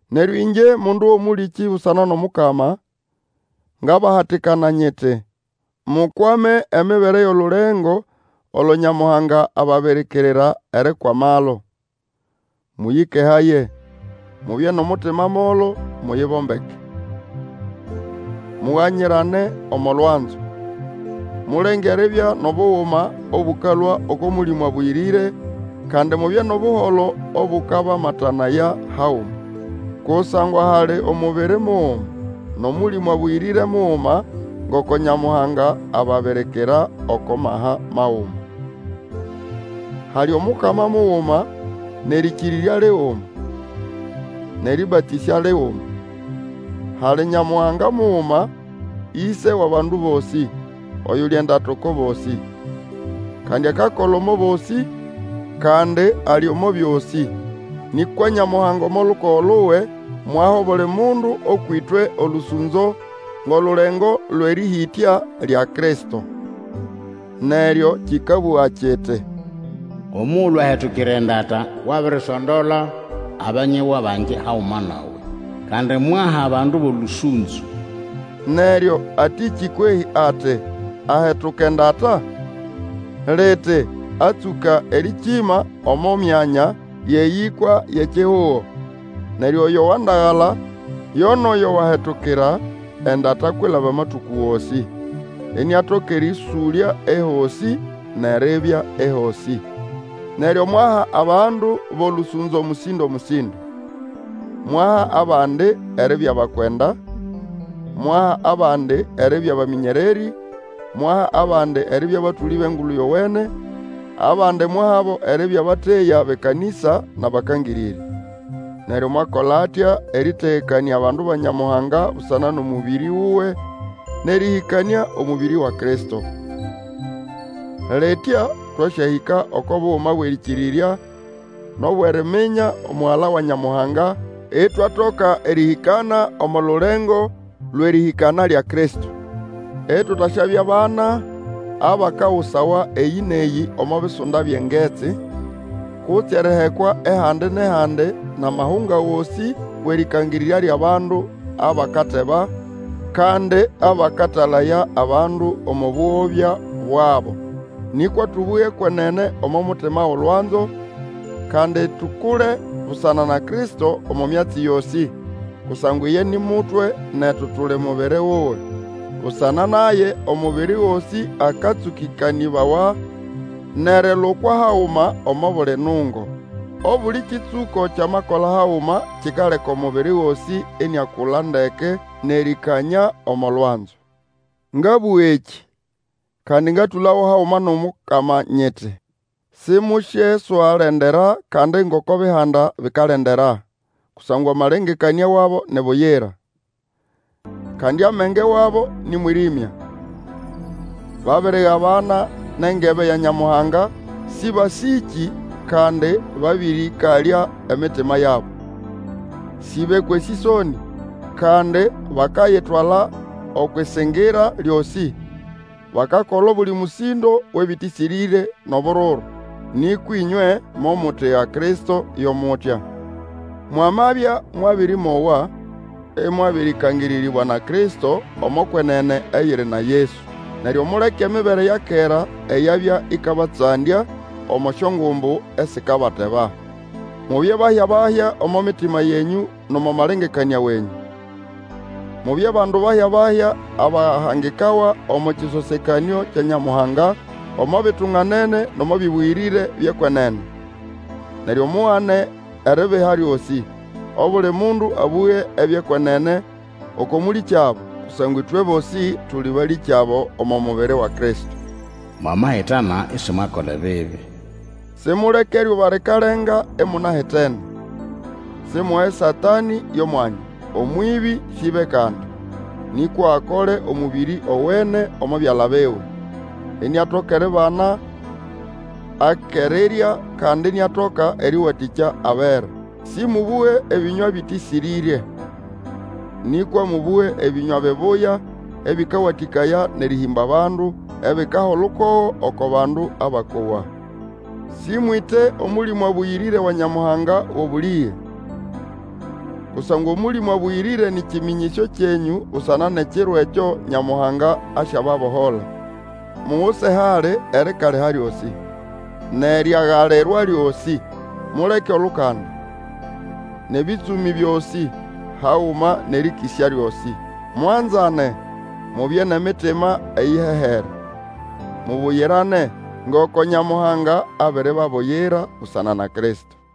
Neryo ĩngye mundu wʼomũlĩkĩ busana nʼomukama, ngabahatikana nyiti, mukwame emibere yʼolulengo olo Nyamuhanga ababirikirira erikwamalo. Mũyĩkehaye, mubye nʼomutima molo, muyibombeke. Muganyirane omo lwanzo. Mulenge eribya nʼobuguma obũkalũa oko Mũlĩmũ Abũyĩrĩre, kandi mubye nʼobuholo obũkabamatanaya haguma. Kusangwa hali omubiri muguma, nʼOmũlĩmũ Abũyĩrĩre muguma, ngoko Nyamuhanga ababirikira oko maha maguma. Hali Omukama muguma, nʼerĩkĩrĩrya liguma, nʼerĩbatĩsya liguma. Hali Nyamuhanga muguma, Ise wʼabandu bosĩ, oyuli endata oko bosĩ. Kandi akakola omo bosĩ, kandi ali omo byosĩ. Nĩkwa Nyamuhanga omo lukogo luwe mwaha obuli mundu ũkwʼĩtwe olũsũnzo ngʼolulengo lwʼerĩhĩtya lya Kristo. Neryo kĩkabũga kiti, Omugulu ahetukira endata, Wabirisondola abanyegwa bangi haguma nawe, Kandi mwaha abandu bʼolũsũnzo. Neryo atĩkĩ kwehĩ ati, ahetuka endata? Liti, atsũka erĩkĩma omo myanya yʼeyĩkwa yʼekihugo. Neryo oyo wandagala, yo nʼoyo wahetukira endata kwilaba amatũkũ gosĩ, iniatoka erĩũsũlya ehosĩ nʼeribya ehosĩ. Neryo mwaha abandu bʼolũsũnzo mũsĩndo-mũsĩndo. Mwaha abandi eribya bakwenda, mwaha abandi eribya bamĩnyererĩ, mwaha abandi eribya batũlĩ bʼEngulu Yowene, abandi mwahabo eribya bateya bʼekanĩsa nʼabakangĩrĩrya. Neryo mwakola atya erĩtegekanĩa abandu ba Nyamuhanga busana nʼomũbĩrĩ wuwe, nʼerĩhĩkanĩa omubiri wa Kristo. Litya twasyahĩka oko buguma bwʼerĩkĩrĩrya nʼobwʼeriminya Omugala wa Nyamuhanga, itwatoka erĩhĩkana omo lulengo lwʼerĩhĩkana lya Kristo. Itutaswabya bana, abakagusawa eyĩ nʼeyĩ omo bisunda byʼengetsi, kutse erihekwa ehandi nʼehandi nʼamahunga gosĩ wʼerĩkangĩrĩrya lyʼabandu abakateba, kandi abakatalaya abandu omo bũgobya bwabo. Nĩkwa tũbũge ekwenene omo mutima wʼolwanzo, kandi tukule busana na Kristo omo myatsi yosĩ, kusangwa iye ni mutwe netu tuli mubiri wuwe. Busana naye omubiri gosĩ akatsũkĩkanĩbawa nʼerilukwa haguma omo buli nungo. Obuli kĩtsũko kyamakola haguma kikaleka omubiri gosĩ iniakula ndeke nʼerĩkanyĩa omo lwanzo. Ngabũga ekĩ, kandi ngatũlago haguma nʼomukama nyiti, simusyeswalendera kandi ngoko Bihanda bikalendera, kusangwa amalengekanĩa wabo ni buyira. Kandi amenge wabo nĩ mwĩrĩmya. Babirigabana nʼengebe ya Nyamuhanga, sĩbasĩkĩ kandi babĩrĩkalya emitima yabo. Sĩbekwa esĩsonĩ; kandi bakayitwala okwʼĩsĩngĩra lyosĩ, bakakola obuli mũsĩndo wʼebĩtĩsĩrĩre nʼobururu. Nĩkwa ĩnywe, momutiga Kristo yo mutya. Mwamabya mwabĩrĩmowa, ĩmwabĩrĩkangĩrĩrĩbwa na Kristo, omo kwenene eyiri na Yesu. Neryo muleke emibere ya kera eyabya ĩkabatsandya omo syongumbu esikabateba. Mubye bahya-bahya omo mitima yenyũ nʼomo malengekanĩa wenyũ. Mubye bandu bahya-bahya abahangikawa omo kĩsosekanĩo kya Nyamuhanga, omo bitunganene nʼomo bĩbũyĩrĩre byʼekwenene. Neryo mugane eribiha lyosĩ. Obuli mundu abũge ebyʼekwenene oko mũlĩkyabo, kusangwa ĩtwe bosĩ tuli balĩkyabo omo mubiri wa Kristo. Mwamahitana isimwakola ebibi, simuleke eryuba likalenga imunahitene. Simuhe Satanĩ yʼomwanya. Omwĩbĩ syĩbe kandi, nĩkwa akole omũbĩrĩ owene omo byala biwe, iniatoka eribana akʼerirya kandi iniatoka erĩwatĩkya abera. Sĩmũbũge ebĩnywa ebĩtĩsĩrĩre, nĩkwa mũbũge ebĩnywa bibuya ebĩkawatĩkaya nʼerĩhĩmba bandu, ebikaha olukogo oko bandu abakowa. Sĩmwĩte Omũlĩmũ Abũyĩrĩre wa Nyamuhanga wʼobũlĩge, kusangwa Omũlĩmũ Abũyĩrĩre nĩ kĩmĩnyĩsyo kyenyũ busana nʼekiro ekyo Nyamuhanga asyababohola. Muguse hali erikaliha lyosĩ, nʼeryagalirwa lyosĩ, muleke olukanda, nʼebĩtsũmĩ byosĩ, haguma nʼerĩkĩsya lyosĩ. Mwanzane, mubye nʼemitima eyihehere, mubuyirane, ngoko Nyamuhanga abiribabuyira busana na Kristo.